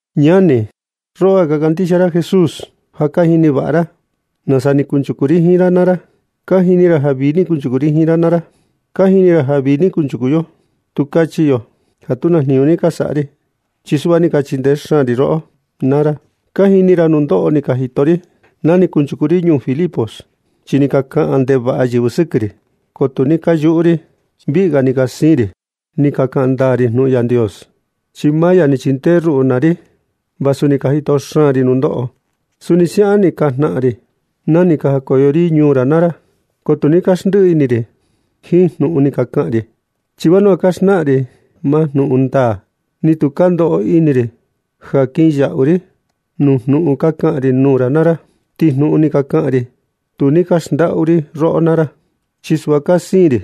Ñani, roꞌo ja ka kandixia Jesús, ja ka jini vaꞌa ra nasa ni kuchuku ri jiin ra naa ra. Ka jini ra ja vii ni kunchuku ri jiin ra naa ra. Ka jini ra ja vii ni kunchuku yo. Tu kachi yo ja tu na jniñu ni ka saꞌa ri, chi suꞌva ni ka chindee xaan ri roꞌo naa ra. Ka jini ra nundoꞌo ni ka jito ri na ni kunchuku ri ñuu Filipos. Chi ni ka kaꞌan ndevaꞌa yɨvɨ sɨkɨ ri, ko tu ni ka yuꞌu ri, chi viꞌi ga ni ka siin ri ni ka kaꞌan ndaa ri jnuꞌun Yandios, chi maa ya ni chindee ruꞌu naa ri vasu ni ka jito xaan ri nundoꞌo. Suni siaꞌan ni ka jnaꞌan ri na ni ka jakoyo ri ñuu ra naa ra. Ko tu ni ka naxndiꞌi ini ri jiin jnuꞌun ni ka kaꞌan ri, chi vanua ka xnaꞌan ri maa jnuꞌun ndaa. Ni tu ka ndoꞌo ini ri ja kinyaꞌu ri nuu jnuꞌun ka kaꞌan ri nuu ra naa ra. Ti jnuꞌun ni ka kaꞌan ri tu ni ka xndaꞌu ri roꞌo naa ra. Chi suꞌva ka siin ri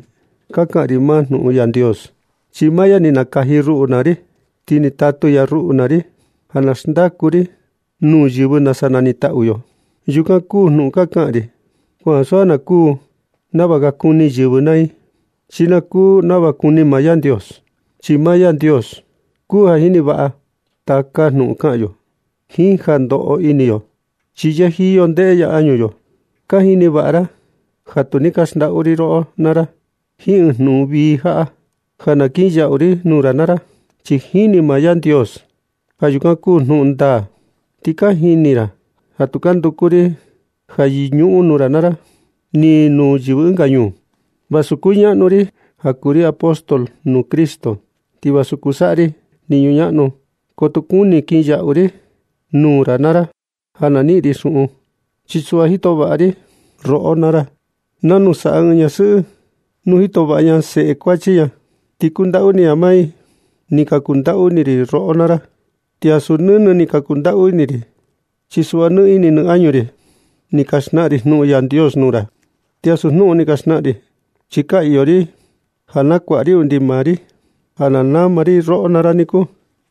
ka kaꞌan ri maa jnuꞌun Yandios, chi maa ya ni nakaji ruꞌu naa ri, ti ni tatu ya ruꞌu naa ri ja na xndaku ri nuu yɨvɨ nasa nanitaꞌu yo. Yukan kuu jnuꞌun ka kaꞌan ri, ko ansu ja na kuu nava ka kuni yɨvɨ naa i, chi ja na kuu nava kuni maa Yandios. Chi maa Yandios kuu ja jini vaꞌa taka jnuꞌun kaꞌan yo jiin ja ndoꞌo ini yo, chi yɨjiyo ndeꞌe ya añu yo. Ka jini vaꞌa ra ja tu ni ka xndaꞌu ri roꞌo naa ra jiin ɨɨn jnuꞌun vii jaꞌa, ja na kin yaꞌu ri nuu ra naa ra, chi jini maa Yandios ja yukan kuu jnuꞌun ndaa. Ti ka jini ra ja tu ka nduku ri ja yɨñuꞌun nuu ra naa ra, ni nuu yɨvɨ ɨnga ñuu. Vasu kuñaꞌnu ri ja kuu ri apóstol nuu Cristo, ti vasu kuu saꞌa ri jniñu ñaꞌnu, ko tu ni kuni kinyaꞌu ri nuu ra naa ra ja na niꞌin ri xuꞌun. Chi suꞌva ni jito vaꞌa ri roꞌo naa ra nanu saꞌa ɨɨn ñasɨꞌɨ nu jito vaꞌa ña seꞌe kuachi ña, chi kundaꞌu ini ña maa i. Ni ka kundaꞌu ini ri roꞌo naa ra, ti ansu nɨnɨ ni ka kundaꞌu ini ri, chi suꞌva jiin nɨ ini nɨ añu ri ni ka xnaꞌan ri jnuꞌun Yandios nuu ra. Ti ansu jnuꞌun un ni ka xnaꞌan ri, chi ka iyo ri ja na kuaꞌa ri undi maa ri ja na nama ri roꞌo naa ra niku.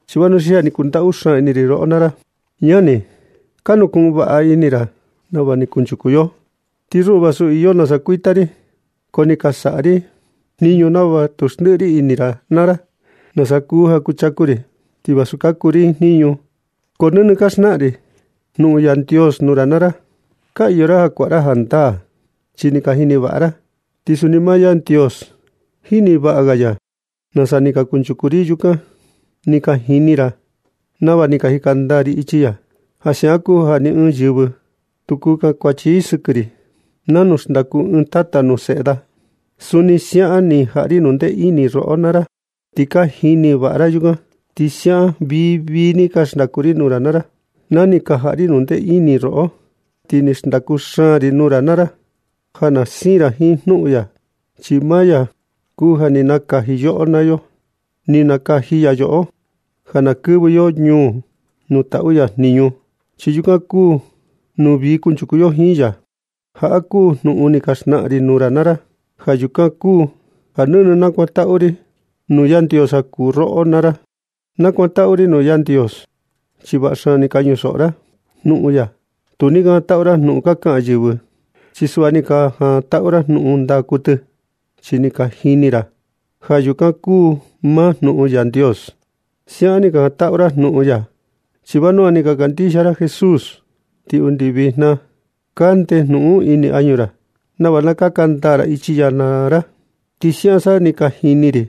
Chi vanua ni ka kundaꞌu xaan ini ri roꞌo naa ra. Ñani, ka nukuꞌun vaꞌa ini ra nava ni kunchuku yo. Ti ruꞌu, vasu iyo nasa kuita ri, ko ni ka saꞌa ri jniñu nava tu xndiꞌi ri ini ra naa ra nasa kuu ja kuchaku ri. Ti vasu kaku ri jiin jniñu, ko nɨnɨ ka xnaꞌan ri jnuꞌun Yandios nuu ra naa ra. Ka iyo ra ja kuaꞌa ra jandaa chi ni ka jini vaꞌa ra, ti suni maa Yandios jini vaꞌa ga ya nasa ni ka kunchuku ri yukan. Ni ka jini ra nava ni ka jika ndaa ri ichi ya. Ja siaꞌan kuu ja ni ɨɨn yɨvɨ tu kuu kankuachi i sɨkɨ ri. Nanu xndaku ɨɨn tata nuu seꞌe da, suni siaꞌan ni ka jaꞌa ri jnundee ini roꞌo naa ra, ti ka jini vaꞌa ra yukan. Ti siaꞌan vii vii ni ka xndaku ri nuu ra naa ra na ni ka jaꞌa ri jnundee ini roꞌo. Ti ni xndaku xaan ri nuu ra na ra ja na siin ra jiin jnuꞌun ya, chi maa ya kuu ja ni nakaji yoꞌo naa yo. Ni nakaji ya yoꞌo ja na kɨvɨ yo ñuu nuu taꞌu ya jniñu, chi yukan kuu nuu vii kunchuku yo jiin ya. Jaꞌa kuu jnuꞌun ni ka xnaꞌan ri nuu ra naa ra. Ja yukan kuu ja nɨnɨ nakuantaꞌu ri nuu Yandios ja kuu roꞌo naa ra. Na kuantaꞌu ri nuu Yandios chi vaꞌa xaan ni ka ñusoꞌo ra jnuꞌun ya. Tu ni ka jantaꞌu ra jnuꞌun ka kaꞌan yɨvɨ. Chi suꞌva, ni ka jantaꞌu ra ɨɨn jnuꞌun ndaa kuɨtɨ, chi ni ka jini ra ja yukan kuu maa jnuꞌun Yandios. Siaꞌan ni ka jantaꞌu ra jnuꞌun ya, chi vanua ni ka kandixia ra Jesús. Ti undi vijna kande jnuꞌun un ini añu ra nava na kaka ndaa ra ichi ya naa ra. Ti siaꞌan sa ni ka jini ri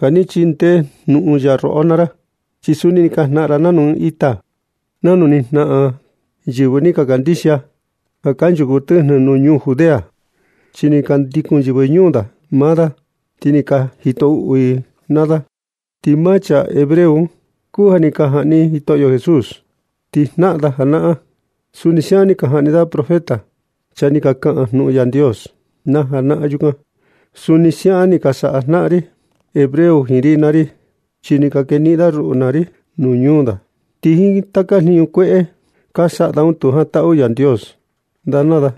ja ni chindee jnuꞌun ya roꞌo naa ra, chi suni ni ka jnaꞌan ra nanu ni ka jnaꞌan yɨvɨ ka kandixia ja kanchuku tɨjnɨ nuu ndañuu Judea, chi ni ka ndikun yɨvɨ ñuu da un maa da, ti ni ka jito uꞌu i da naa da. Ti maa chaa hebreo un ka kuu ja ni ka jaꞌni Jitoꞌo Jesús. Ti jnaꞌan da janaꞌan, suni siaꞌan ni ka jaꞌni da proféta, chaa ni ka kaꞌan jnuꞌun Yandios na janaꞌan yukan. Suni siaꞌan ni ka saꞌa jnaꞌan ri hebreo jiin ri naa ri, chi ni ka keniꞌin da ruꞌu naa ri nuu ñuu da. Ti jiin taka jniñu kueꞌe ka saꞌa da un tu jantaꞌu Yandios da naa da,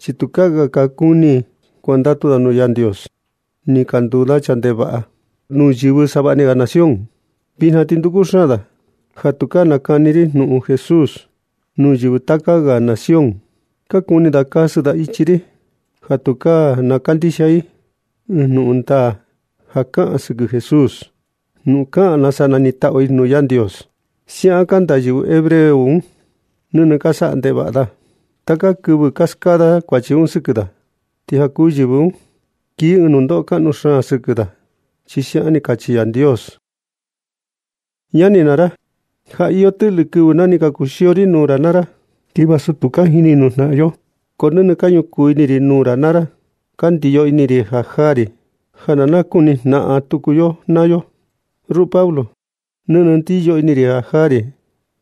chi tukaa ga ka kuni kuandatu da Yandios. Ni ka nduu da chaa ndevaꞌa nuu yɨvɨ savaꞌni ga nación. Vijna ti nduku xaan da ja tukaa na kaꞌan ri jnuꞌun Jesús nuu yɨvɨ taka ga nación. Ka kuni da kasɨ da ichi i ja tukaa na kandixia i ɨɨn jnuꞌun ndaa ja kaꞌan sɨkɨ Jesús, nuu kaꞌan nasa nanitaꞌu i nuu Yandios. Siaꞌan kanda yɨvɨ hebreo un, chi nɨnɨ ka saꞌa ndevaꞌa da. Taka kɨvɨ ka skaa da kuachi un sɨkɨ da. Ti ja kuu yɨvɨ un kii ɨɨn nundoꞌo kaꞌnu xaan ga sɨkɨ i, chi siaꞌan ni kachi Yandios. Ñani naa ra, ja iyo tɨꞌlɨ kɨvɨ na ni ka kuxio ri nuu ra naa ra. Ti vasu tu ka jini nuu jnaꞌan yo, ko nɨnɨ ka ñukuu ini ri nuu ra naa ra. Ka ndiyo ini ri jaa ri ja na nakuni jnaꞌan tuku yo naa yo. Ruꞌu Pablo, nɨnɨ ndiyo ini ri jaa ri,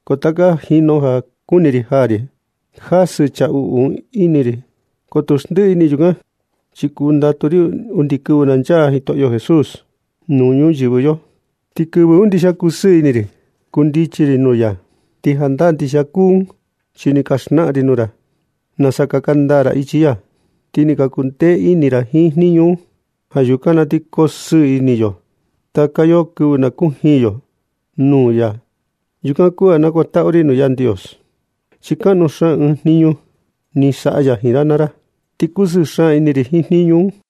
ko taka jinu ja kuni ri jaa ri, ti jasɨ chaa uꞌu un ini ri. Ko tu xndiꞌi ini ri yukan, chi kundatu ri undi na nchaa tuku Jitoꞌo Jesús nuu ñuyɨvɨ yo, ti kɨvɨ un ndixia na ti ndusɨɨ ini ri kundichi ri nuu ya. Ti jandaa ndixia kuu un, chi ni ka xnaꞌan ri nuu ra nasa kaka ndaa ra ichi ya, ti ni ka kuu ndee ini ra jiin jniñu un. Ja yukan na ti koo sɨɨ ini taka yo kɨvɨ nu na kujiin yo nuu ya. Yukan kuu ja nakuantaꞌu ri nuu Yandios chi kaꞌnu xaan ɨɨn jniñu ni saꞌa ya jiin ra naa ra, ti kusɨɨ xaan ini ri jiin jniñu un.